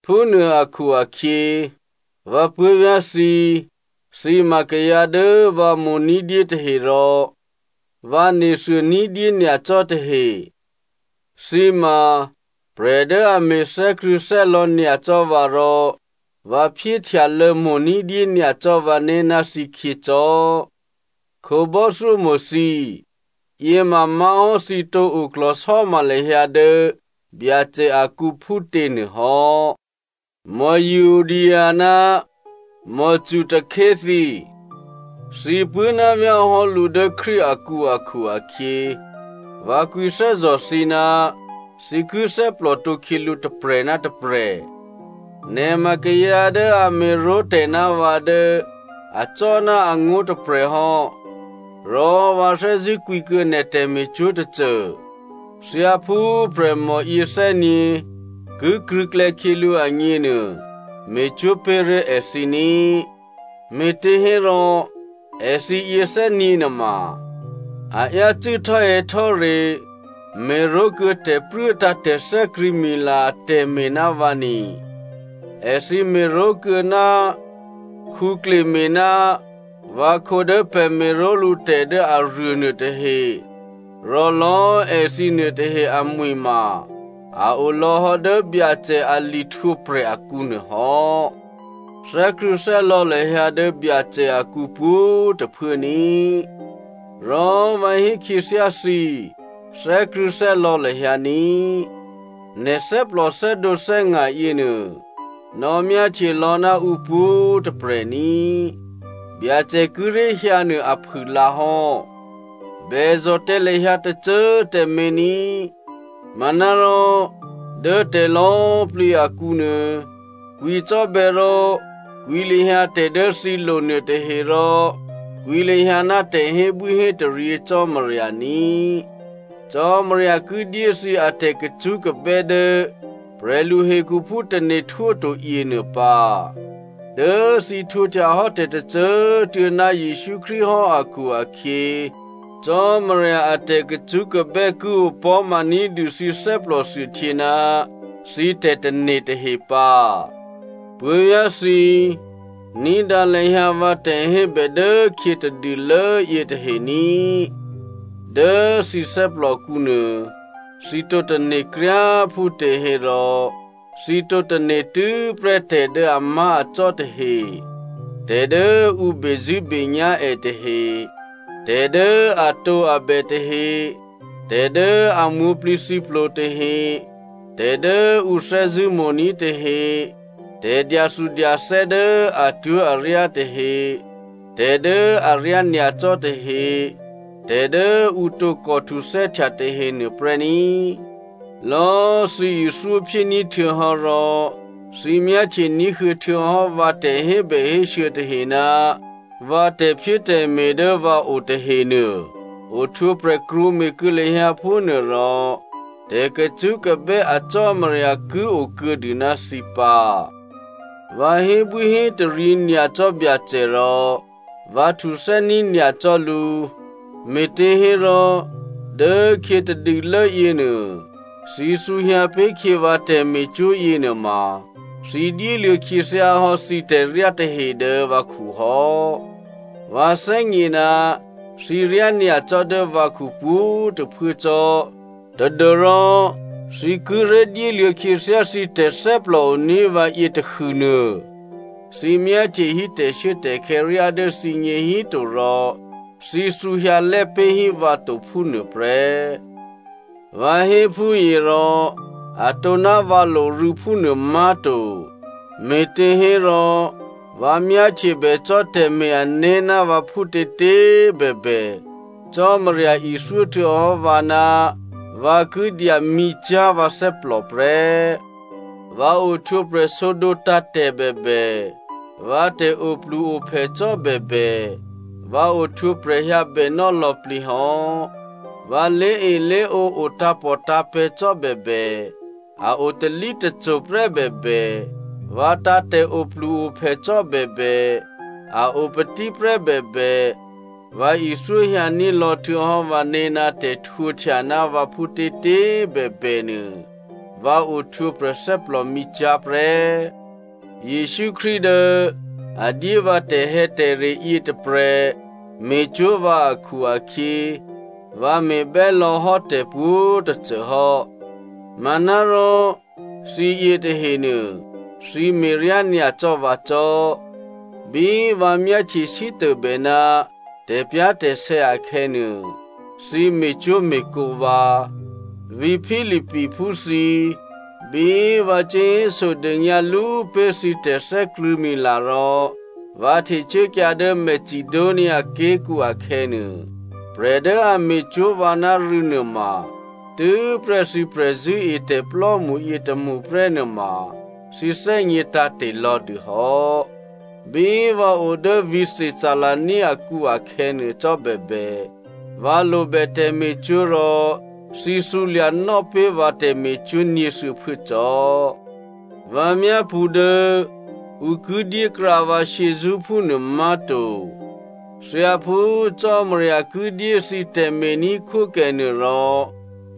Phúnuô akhu-akhyě, vǎ puố̤vyá̤ thǐ꤮, thǐ ma kayǎ dố vǎ mo̤ ní̤dyé tahe rò vǎ nethuô ní̤dyé nyacò́ tahe, thǐ ma prè̤ dố a me̤ thè́krṳ̂̌thè́lò̌ nyacò́ vǎ rò vǎ phyéhtyalô̌mo̤ ní̤dyé nyacò́ vǎné̤ ná thǐkhyě cò́. Khǒbò́thyómo̤ thǐ꤮ yě ma má̤hò́ thǐ tǒ oklò̤sò́ma lahyǎ dố Byacè akǔ phútěnuô hò́. Euodia ná Syntyche thǐ꤮, thǐ puố̤návyá̤ hò́ lǔ dố Krístu akǔ akhu-akhyě, vǎ kwǐthè́zò̤ thǐ ná thǐ ki thè́plòtǒ khyělǔ tôprè̤ ná tôprè̤. Nè̤ ma kayǎ dố a me̤ró̤ tè̤ ná vǎ dố acò́ ná angó̤ tôprè̤ hò́, rò vǎ thè́zṳ̂́ kwǐkuô̌ nè̤ tè̤me̤cwó̤ tôcô, thyáphú prè̤mòyě thè́gně ki krṳ̂̌klè̌ khyělǔ agněnuô, me̤cwó̤ pé̤ré̤ èthǐ ní꤮. Me̤těhérò èthǐ yěthè́nyě̤ nuôma a yácû́ htò́hè̌htò́re me̤ró̤kuô̌ tè̤pruốtǎ̤ tè̤thè́krṳ̂̌mila atè̤me̤ ná vǎ ni. Èthǐ me̤ró̤kuô̌ ná Clemente ná vǎkhǒ dố pè̤ me̤ró̤lǔ tè̤ dố aruô nuôtahe, rò lò̌꤮ èthǐ nuôtahe amwi̤ ma a o lò̌hò́ dố Byacè a lihtwǒprè̤ akǔ nuôhò́. Thè́krṳ̂̌thè́lò̌ lahyǎ dố Byacè akǔ pwǒ̤꤮ tôphuố ní꤮, rò vǎ hé khyěthyá thǐ, thè́krṳ̂̌thè́lò̌ lahyǎ ní꤮. Nè̤ thè́plò thè́dǒthè́nga̤ yěnuô nò̌myáhtye lò̌ ná ǔpwǒ̤꤮ tôprè̤ ní꤮. Byacè kíré̤ hyǎnuô aphûlǎhò́. Bèzò̤ tǎ lahyǎ tôcô꤮ tǎmé̤ ní꤮. Manárò dố tè̤lò̌꤮ plǐ akǔnuô, kwǐcò́bè̌ rò kwǐ lahyǎ tè̤ dố thǐ lo nuôtahe, rò kwǐ lahyǎ ná tè̤hébwíhétaryě Cò́marya ní꤮. Cò́marya ki dyé thǐ atè̤kacṳ́kabè́ dố prè̤lu hekhuphú tane̤ htwóto yěnuô pǎ. Dố thǐ htwǒhtya hò́ tè̤tôcô꤮ tuô̌ ná Jesǔ Krístu hò́ akhu-akhyě, Cò́marya a tè̤kacṳ́kabè́ ki opò̤́ma ní̤dû thǐ thè́plòthuôhtyě ná thǐ tè̤tane̤ tahe pǎ. Puố̤vyá̤thǐ, ní̤dǎ lahyǎ vǎ tè̤hébè dốkhyě tadûlố yětahe ní꤮. Dố thǐ thè́plòkǔ nuô thǐ tǒ tane̤ kryá꤮ phútěhérò, thǐ tǒ tane̤ tû́prè́ tè̤dố amá̤acò́ tahe, tè̤dố ǔ bezṳ̂́benyá̤ è tahe, tè̤dố atǒabè tahe, tè̤dố a mwǒ̤plǐthǐplo tahe, tè̤dố ǔ thè́zṳ̂́mo̤ní̤ tahe, tè̤dyathudyathè́ dố atwó̤aryá tahe, tè̤dố aryá nyacò́ tahe, tè̤dố ǔ tǒkò htuthè́htya tahe nuôprè́ ní꤮. Lò̌꤮ thǐ ithyóphyéní̤ htuô̌hò́ rò thǐ myáhtye ní̤huô̌ htuô̌hò́ vǎ tè̤hébèhésû̌ tahe ná vǎ tè̤phyétè̤me̤ dố vǎ o tahenuô, ohtwǒprè̤ krwǒme̤ kuô̌ lahyǎ phúnuô rò tè̤kacṳ́kabè́ a Cò́marya ki o kuô̌dû ná thǐ pǎ. Vǎ hébwíhétaryě nyacò́ Byacè rò vǎ htuthè́ní̤ nyacò́ lǔ, me̤těhérò dố khyě tadûlố yěnuô, thǐ thǔhyǎ pé̤ khyě vǎ tè̤me̤cwó̤ yěnuôma thǐ dyéluô̌ khyěthyá hò́ thǐ tè̤ryá tahe dố vǎkhu hò́. Vǎ thè́gně ná thǐ ryányacò́ dố vǎkhu pwǒ̤꤮ tôphuố cò́ tadû́rò thǐ kíré̤ dyéluô̌ khyěthyá thǐ tè̤thè́plòoní̤ vǎ yětahûnuô, thǐ myáhtye hí tè̤shuốtè̤khè̌ ryá dố thǐgně híto rò thǐ thǔhyǎlè́ pé̤hí vǎ to phúnuôprè́. Vǎ hé phúyě rò atǒ ná vǎ lorû̌ phúnuô má̤to, me̤těhérò vǎ myáhtyebè cò́ tè̤me̤-ané̤ ná vǎ phútětě꤮ bèbè, Cò́marya ithyó htuô̌hò́ vǎ ná vǎ ki dyamǐcyá̤ vǎ thè́plò prè́. Vǎ ohtwǒprè̤ sǒdǒ tǎ̤tè̤ bèbè, vǎ tè̤ oplu-ophè cò́ bèbè, vǎ ohtwǒprè̤hyǎ bènò́ lò̌plǐ hò́. Vǎ lé̤elé̤ǒ o tǎ̤pòtǎ̤pè̤̌ cò́bèbè, a o talítaki prè́ bèbè, vǎ tǎ̤tè̤ oplu-ophè cò́ bèbè, a o patí prè́ bèbè, vǎ ithyó hyǎní̤ lò̌ htuô̌hò́ vǎné̤ ná tè̤htwǒhtya ná vǎ phútětě꤮ bèbènuô, vǎ ohtwǒprè̤ thè́plòmǐcyá̤ prè́. Jesǔ Krístu dố a dyé vǎ tè̤hè̌tè̤re yětôprè̤ me̤cwó̤ vǎ akhu-akhyě, vǎ me̤bè́lò̌ hò́ tè̤pwǒ̤꤮ tôcô hò́. Manárò thǐ yětahenuô, thǐ me̤ryá nyacò́ vǎ cò́. Bí vǎ myáhtye sítôbè ná tè̤pyá̤tè̤sè̌ akhè̌nuô, thǐ me̤cwó̤me̤kǒ vǎ. Vǐ̤ Philippiphú thǐ꤮. Bí vǎ cuố hésodônyǎ lú pé̤ thǐ tè̤thè́krṳ̂̌mila rò vǎ htecuốkyǎ dố Macedonia ké̤kǔ akhè̌nuô, prè̤ dố a me̤cwó̤ vǎ ná rû̌ nuôma tû́prè́ thǐ prè̤zṳ̂́etè̤plò́mṳ yětômṳ prè́ nuôma thǐ thè́gně tǎ̤te̤ lò̌dû hò́. Bí vǎ o dố vǐ̤ Thessalonia akǔ akhè̌nuô cò́ bèbè, vǎ lobè tè̤me̤cwó̤ rò thǐ thǔlya̤nò́ pé̤ vǎ tè̤me̤cwó̤ nyě̤thuô̌phuố cò́. Vǎ myápṳ̌ dố ǔ ki dyékrǎ vǎ shyězṳ́ phúnuô má̤to. Thyáphú Cò́marya ki dyé thǐ tè̤me̤ní̤khwókè nuôrò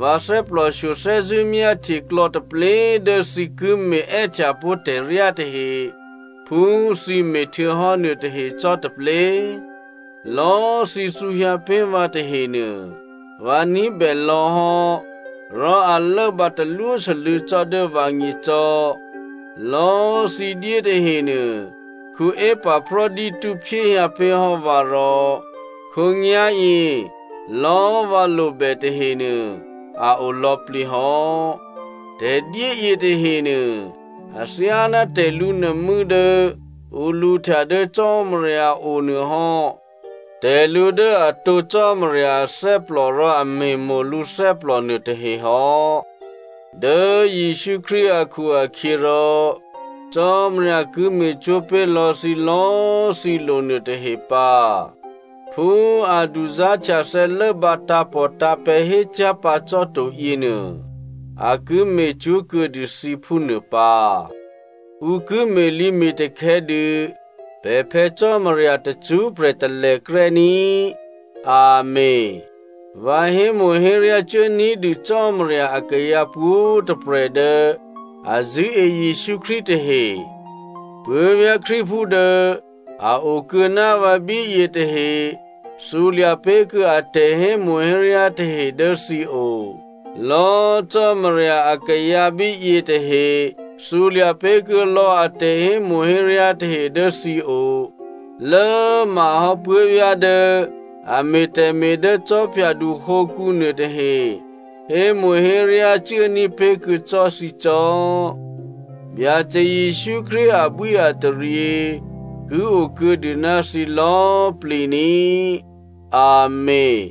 vǎ thè́plòshyo thè́zṳ̂́ myáhtye klò̌taplé꤮ dố thǐ ki me̤ è́htyapó̤ tè̤ryá tahe phú thǐ me̤ htuô̌hò́ nuôtahe cò́taplé. Lò̌꤮ thǐ thǔhyǎ pé̤ vǎ tahenuô vǎ ní̤bè lò̌ hò́, rò a lốbǎ talwósû́lû̌ cò́ dố vǎgně cò́. Lò̌꤮ thǐ dyé tahenuô Epaphrodito phyéhyǎ pé̤ hò́ vǎ rò khǒnyá̤yě lò̌꤮ vǎ lobè tahenuô a o lò̌plǐ hò́. Tè̤dyé yětahenuô, athyáná tè̤lǔnuô̤mû́ dố ǔ lǔhtya dố Cò́marya o nuôhò́, tè̤lǔ dố atǒ Cò́marya athè́plò, rò a me̤mo̤ lǔ thè́plò nuôtahe hò́. Dố Jesǔ Krístu akhu-akhyěrò Cò́marya ki me̤cwó̤ pé̤ lò̌ thǐ lò̌꤮ thǐ lo nuôtahe pǎ. Phú a duzá̤htyathè̌ lốbǎ tǎ̤pòtǎ̤pè̤̌ hécyá̤ pǎ cò́to yěnuô, a ki me̤cwó̤ kuô̌dû thǐ phúnuô pǎ. Ǔ ki me̤lǐme̤takhè̌ dû pè̤ Phè̌ Cò́marya tacṳ́prè̤ talèkrè́ ní꤮. Amèn. Vǎ hémo̤héryá cuố ní̤dû Cò́marya akayǎ pwǒ̤꤮ tôprè̤ dố a zṳ̂́e Jesǔ Krístu tahe. Puố̤vyá̤ Krístuphú dố a o kuô̌ ná vǎ bíyě tahe thǔlya̤ pé̤kuô̌ a tè̤hémo̤héryá tahe dố thǐo. Lò̌꤮ Cò́marya akayǎ bíyě tahe thǔlya̤ pé̤kuô̌ lò̌ a tè̤hémo̤héryá tahe dố thǐo. Lố꤮ mahò́ puố̤vyá̤ dố a me̤ tè̤me̤ dố khwídu hǒkǔ nuôtahe hémo̤héryá cuốní̤ pé̤kuô̌ cò́ thǐ cò́. Byacè Jesǔ Krístu abwíataryě ki okuô̌dû ná thǐ lò̌꤮ plǐ ní꤮. Amèn.